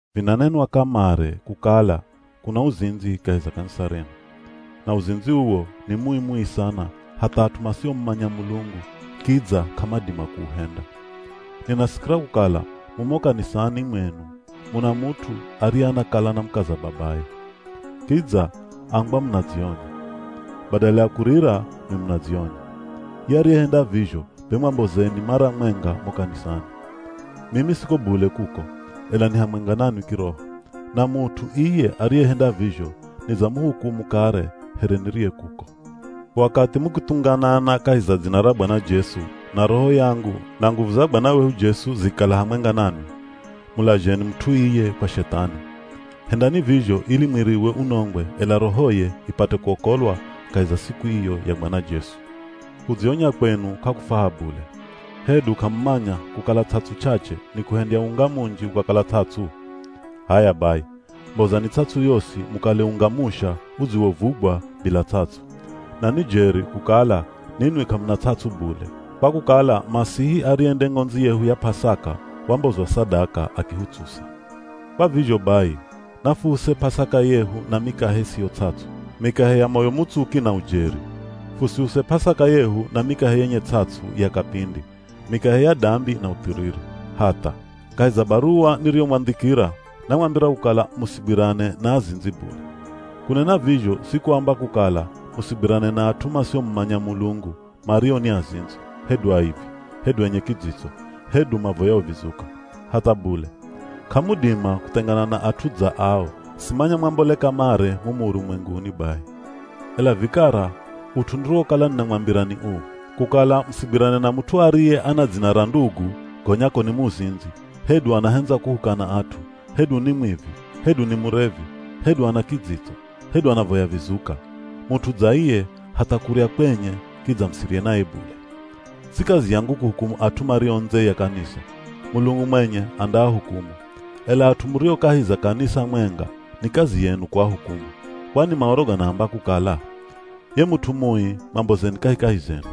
Vinanenwa kamare kukala kuna uzindzi kahi za kanisa renu. Na uzindzi uwo ni mui-mui sana hatha at'u masiomumanya Mulungu kidza k'amadima kuuhenda. Ninasikira kukala mumo kanisani mwenu muna mut'u ariye anakala na mukaza babaye. Kidza ambwa munadzionya. Badala ya kurira nwi munadzionya. Ye ariyehenda vizho be mwambozeni mara mwenga mo kanisani. Mimi siko bule kuko, ela ni hamwenga nanwi kiroho. Na mut'u iye ariyehenda vizho nidzamuhukumu kare here niriye kuko. Wakathi mukithunganana kahi za dzina ra Bwana Jesu, na roho yangu, na nguvu za Bwana wehu Jesu zikikala hamwenga nanwi, mulazheni mut'u iye kwa Shethani. Hendani vizho ili mwiriwe unongwe ela rohoye ipate kuokolwa kahi za siku iyo ya Bwana Jesu. Kudzionya kwenu k'akufwaha bule. Hedu k'amumanya kukala ts'ats'u ch'ach'e ni kuhendya unga munji ukakala ts'ats'u? H'aya bai, mbozani ts'ats'u yosi mukale unga musha udziwovugwa bila ts'ats'u. Na ni jeri kukala ninwi k'amuna ts'ats'u bule kwa kukala Masihi ariye nde ng'ondzi yehu ya P'asaka wambozwa sadaka akihutsusa. Kwa vizho bai, nafuuse P'asaka yehu na mikahe isiyo ts'ats'u, mikahe ya moyo mutsuki na ujeri. Fusiuse P'asaka yehu na mikahe yenye ts'ats'u ya kapindi, mikahe ya dambi na uthiriri. Hatha! Kahi za baruwa niriyomwandhikira, namwambira kukala musigwirane na azindzi bule. Kunena vizho si kuamba kukala musigwirane na at'u masiomumanya Mulungu mario ni azindzi, hedu aivi, hedu enye kidzitso, hedu mavoyao vizuka. Hatha bule. K'amudima kuthengana na at'u dza ao, simanya mwambole kamare mumu urumwenguni bai. Ela vikara ut'u niriwokala ninamwambira ni uu: kukala musigwirane na mut'u ariye ana dzina ra ndugu gonya ko ni muzindzi, hedu anahendza kuhukana at'u, hedu ni mwivi, hedu ni murevi, hedu ana kidzitso, hedu anavoya vizuka. Mut'u dza iye, hatha kurya kwenye kidza musirye naye bule. Si kazi yangu kuhukumu at'u mario ndze ya kanisa, Mulungu mwenye andaahukumu. Ela at'u murio kahi za kanisa mwenga ni kazi yenu kuahukumu. Kwani Maoro ganaamba kukala, “Ye mut'u mui mwambozeni kahikahi zenu.”